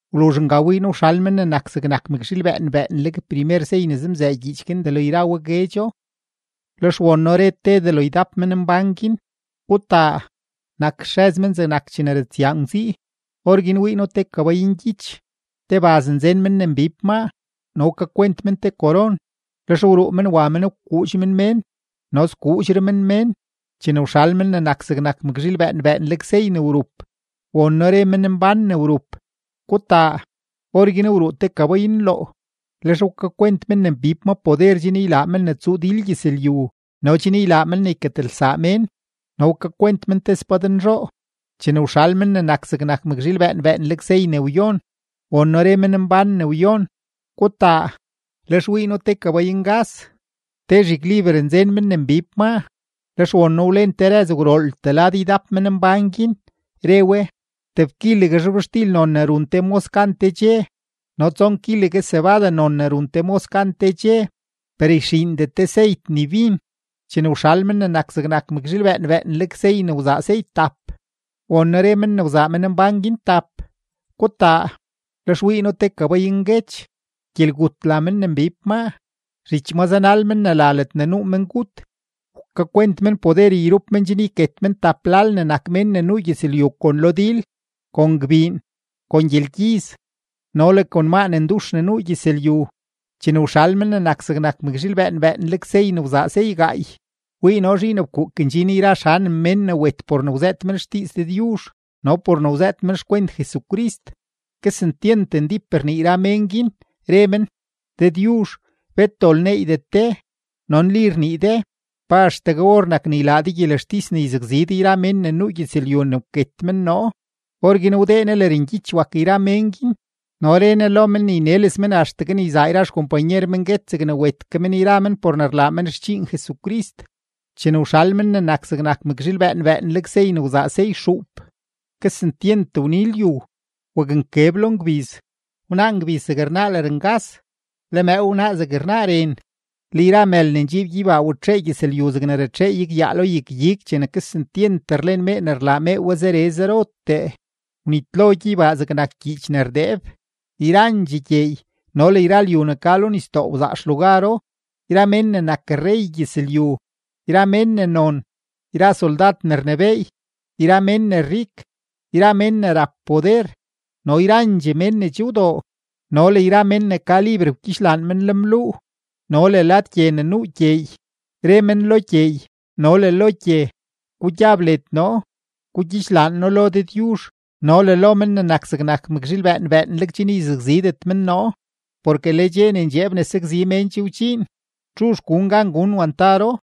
Wluzh nga wii noo wxal Men ne nak zegnak mëkzhiil bëën bëënleg primer sey ne zemzëë gyiich guin delo yra we guedxo, lex won noo re te delo ydap menmbán guin: ―¡Gutaa! Nak xrëz men zegnak chene ratsyaa ngwzii. Orguin wii noo te kabay ngyich; te baz nzen men ne mbib maa no wkakwent men te koron; lex wruu men wa men wkuudx men mén no skuudxre men mén. Chene wxal Men ne nak zegnak mëkzhiil bëën bëënleg sey ne wrup, won noo re menmbán ne wrup: ―¡Gutaa! Orguin wruu te kabay nloo; lex wkakwent men ne mbib ma poder chen ylaa men ne tsuu dil gyëzlyu no chen ylaa men ne yketelsaa mén, no wkakwent men te spadnzhoo. Chene wxal Men ne nak zegnak mëkzhiil bëën bëënleg sey ne wyon, won noo re menmbán ne wyon: ―¡Gutaa! Lex wii noo te kabay ngas; te zhigliber nzen men ne mbib maa. Lex won noo wlen te rëz gwrooltee lad yra ydap menmbán guin, re we: ―Teb kilegue zhobxtil non ne run te mos gan te dxe no tson kilegue cebada non ne run te mos gan te dxe; per yxiindet de seyt ni bin. Chene wxal Men ne nak zegnak mëkzhiil bëën bëënleg sey ne wzaa sey tap, won noo re men ne wzaa menmbán guin tap: ―¡Gutaa! Lex wii noo te kabay nguech; Gyelgut la men ne mbib maa; zhich ma zanal men ne la Ledne Nuu Mengut. Wkakwent men poder yrup men chen yket men tebtap lal ne nak mén ne nuu gyëzlyu kon lo dil, kon gbiin, kon gyelgyiz, no le kon maa ne ndux ne nuu gyëzlyu. Chene wxal Men ne nak zegnak mëkzhiil bëën bëënleg sey ne wzaa sey gaay, wii noo zhiin fkuuk ndxin yra xanem mén ne wet por ne wzëët men xdiiz Dëdyuzh no le por ne wzëët men xkwent Jesucrist. Kesentyent ndíp rnii yra mén guin, re men: ―Dëdyuzh, bet dol neeydet de no nli rnii de. ¿Pa axtegue or nak ne ylaa de gyelextis ne yzakzi de yra mén ne nuu gyëzlyu ne wket men noo? Orguin wdee Ne lërngyich wak yra men guin, no re Ne lo men ne yneles men axtegue ne yzaa yra xkompanyer men guet zegne wet ke men yra men por ne rlaa men xdxiin Jesucrist. Chene wxal Men ne nak zegnak mëkzhiil bëën bëënleg sey ne wzaa sey xuup, kesentyent wni lyu. Waknkeb lo ngbiz, wnaa ngbiz zeg rnaa lërngas, le mëëw wnaa zeg rnaa ren. Le yra mël ne ndxiib gyeybaa watxee gyëzlyu zegne ratxee igyaa lo yag-ig chene kesentyent rlen mee ne rlaa mee we zere zerotee. Wnitlo gyeybaa zegnak gyiich ne rdeeb; yrandxee gyeey no le yra lyu ne ka lo nisdoo wzaa xlugaro. Yra mén ne nak rrey gyëzlyu, yra mén ne non, yra soldad ne rnebééy, yra mén ne rik, yra mén ne rap poder no yrandxee mén ne che wdoo no le yra mén ne ka liber wgyidxlaan lenbluu no le lad gye ne nuu gyeey; re men lo gyeey no le lo gye: ―Gugyab led noo, gugyixlaan noo lo Dëdyuzh no le lo Men ne nak zegnak mëkzhiil bëën bëënleg chen yzakzidet men noo. Porke le dxe ne ndxeeb ne sakzi mén che wdxiin; ¿txuzh gun gan gun wantaro?